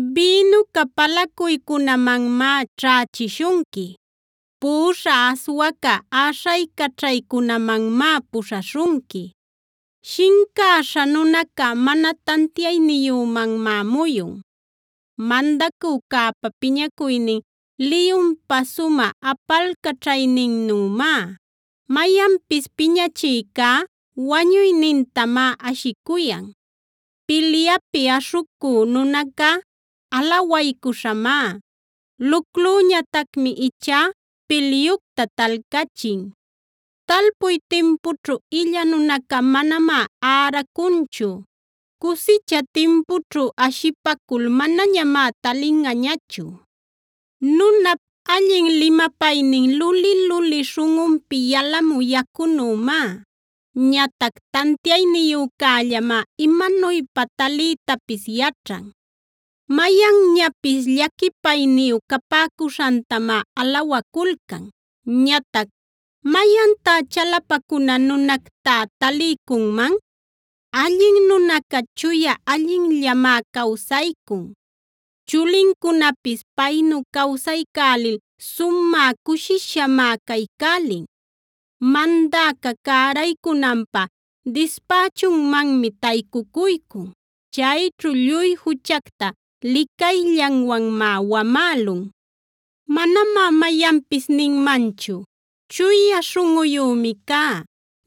Bïnuca palacuycunamanmá ćhächishunqui, puꞌuśha aswaca äśhaycaćhaycunamanmá puśhaśhunqui. Shincäśha nunaca mana tantiayniyümanmá muyun. Mandacücäpa piñacuynin liyunpa sumä apalcaćhayninnümá; mayanpis piñachïcá wañuynintamá ashicuyan. Pilyapi aśhucü nunaca alawaycuśhamá; luclüñatacmi ichá pilyucta talcachin. Talpuy timpućhu illa nunaca manamá äracunchu; cusicha timpućhu ashipacul manañamá talinꞌañachu. Nunap allin limapaynin luli-luli śhunꞌunpi yalamü yacunümá; ñatac tantiayniyücällamá imanuypa taliytapis yaćhan. Mayanñapis llaquipayniyu capäcuśhantamá alawaculcan; ñatac ¿mayantá chalapacuna nunactá taliycunman? Allin nunaca chuya allinllamá cawsaycun; chulincunapis paynu cawsaycälil sumä cushishamá caycälin. Mandäca cäraycunanpä dispächunmanmi taycucuycun; chayćhu lluy juchacta licayllanwanmá wamälun. Manamá mayanpis ninmanchu: “Chuya śhunꞌuyümi cá;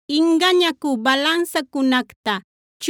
Ingañacü balansacunacta,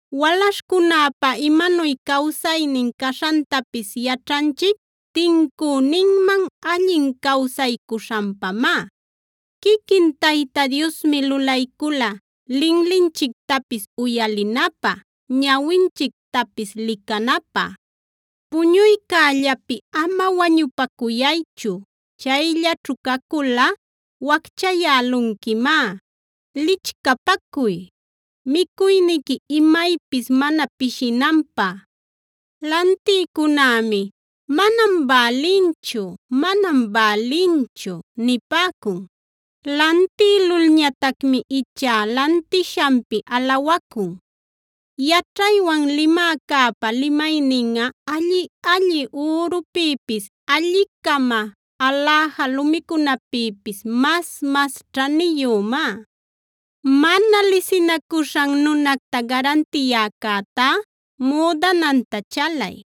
Walaśhcunäpa imanuy cawsaynin caśhantapis yaćhanchic tincüninman allin cawsaycuśhanpamá. Quiquin Tayta Diosmi lulaycula linlinchictapis uyalinapä, ñawinchictapis licanapä. Puñuycällapi ama wañupacuychu; chayllaćhu caculꞌa wacchayälunquimá. Lichcapacuy; micuyniqui imaypis mana pishinanpä. Lantïcunämi: “Manam bälinchu, manam bälinchu” nipäcun; lantïlulñatacmi ichá lantishanpi alawacun. Yaćhaywan limäcäpa limayninꞌa alli-alli ürupïpis, alli-cama aläja lumicunapïpis mas-mas ćhaniyümá. Mana lisinacuśhan nunacta garantiyäcätá müdananta chalay;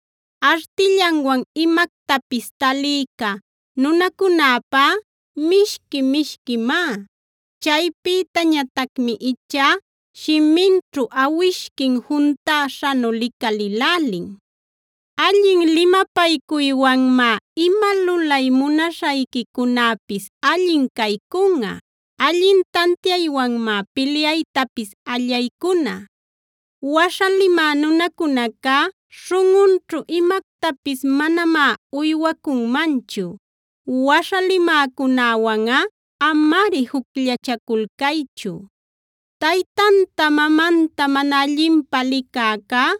Artillanwan imactapis taliyca nunacunäpá mishqui-mishquimá; chaypïtañatacmi ichá shiminćhu awishquin juntäśhanu licalïlälin. Allin limapaycuywanmá ima lulay munaśhayquicunäpis allin caycunꞌa; allin tantiaywanmá pilyaytapis allaycuna. Waśha limä nunacunacá śhunꞌunćhu imactapis manamá uywacunmanchu; waśha limäcunäwanꞌa amari jucllachaculcaychu. Taytanta mamanta mana allinpä licäcá,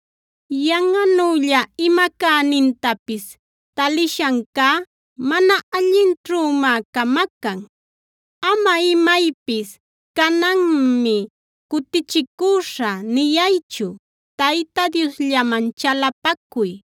Yanꞌanülla ima cänintapis talishancá mana allinćhümá camacan. Ama imaypis: “Cananmi cutichicüśhä” niyaychu. Tayta Diosllaman chalapacuy;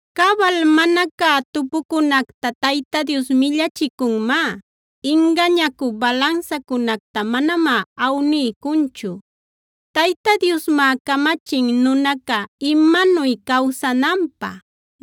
Cabal mana cä tupucunacta Tayta Dios millachicunmá; ingañacü balansacunacta manamá awniycunchu. Tayta Diosmá camachin nunaca imanuy cawsananpä;f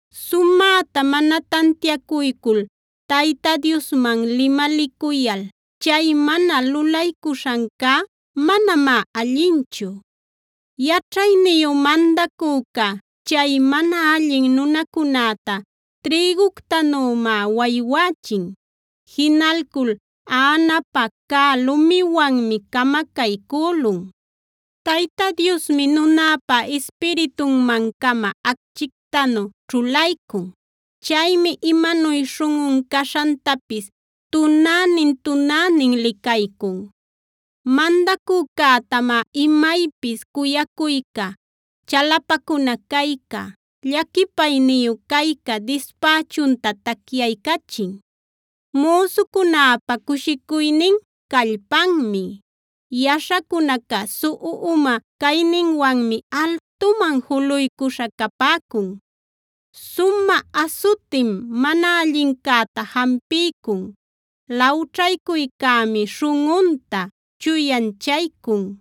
Sumäta mana tantiacuycul Tayta Diosman limalicuyal chay mana lulaycuśhancá manamá allinchu. Yaćhayniyu mandacüca chay mana allin nunacunäta trïguctanümá waywächin; jinalcul aꞌanapäh cä lumiwanmi camacaycülun. Tayta Diosmi nunäpa ispiritunman-cama acchictanu ćhulaycun; chaymi imanuy śhunꞌun caśhantapis tunänin-tunänin licaycun. Mandacücätamá imaypis cuyacuyca, chalapacuna cayca, llaquipayniyu cayca dispächunta tacyaycachin. Müsucunäpa cushicuynin callpanmi; yaśhacunaca suꞌu uma cayninwanmi altuman juluycuśha capäcun. Sumä asutim mana allincäta jampiycun; lawćhaycuycämi śhunꞌunta chuyanchaycun.